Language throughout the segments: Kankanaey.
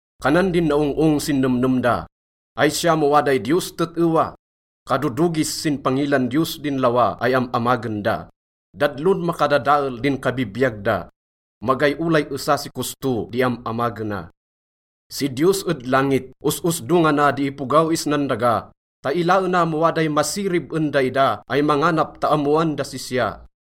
Kanan din naong-ong sin nemnem da, “Ay siya mo waday Diyos tet-ewa?” Kadodogis sin pangilan Diyos din lawa ay am-amagen da, dadlon makadadael din kabibiyag da. Magay olay esa si kosto di am-amagena. Si Diyos ed langit, os-osdongana di ipogaw isnan daga ta ilaena mo waday masirib en daida ay manganap ta ammoan das sisya.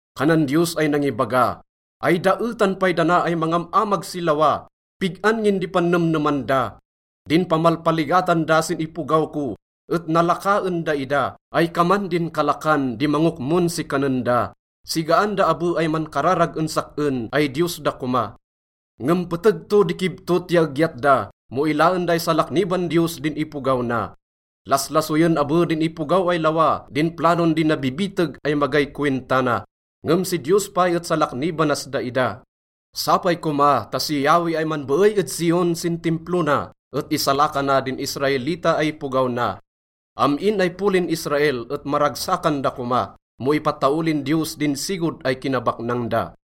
Kanan Diyos ay nangibaga, “Ay daetan pay dana ay mangam-amag si lawa! Pig-an ngin di pannemneman da? Din pamalpaligatan da sin ipogaw ko et nalaka en daida ay kaman din kalakan di mangokmon si kanen da. Sigaan da abe ay mankararag en sak-en ay Diyos da koma.” Ngem peteg to di kibtot ya egyat da mo ilaen da ay salakniban Diyos din ipogaw na. Laslasoyen abe din ipogaw ay lawa din planon di nabibiteg ay magay kowinta na, ngem si Diyos pay et salaknibanas daida. Sapay koma ta si Yahweh ay manbeey ed Zion sin Timplo na et isalakana din Israelita ay ipogaw na. Am-in ay polin Israel et maragsakan da koma mo ipataolin Diyos din sigod ay kinabaknang da.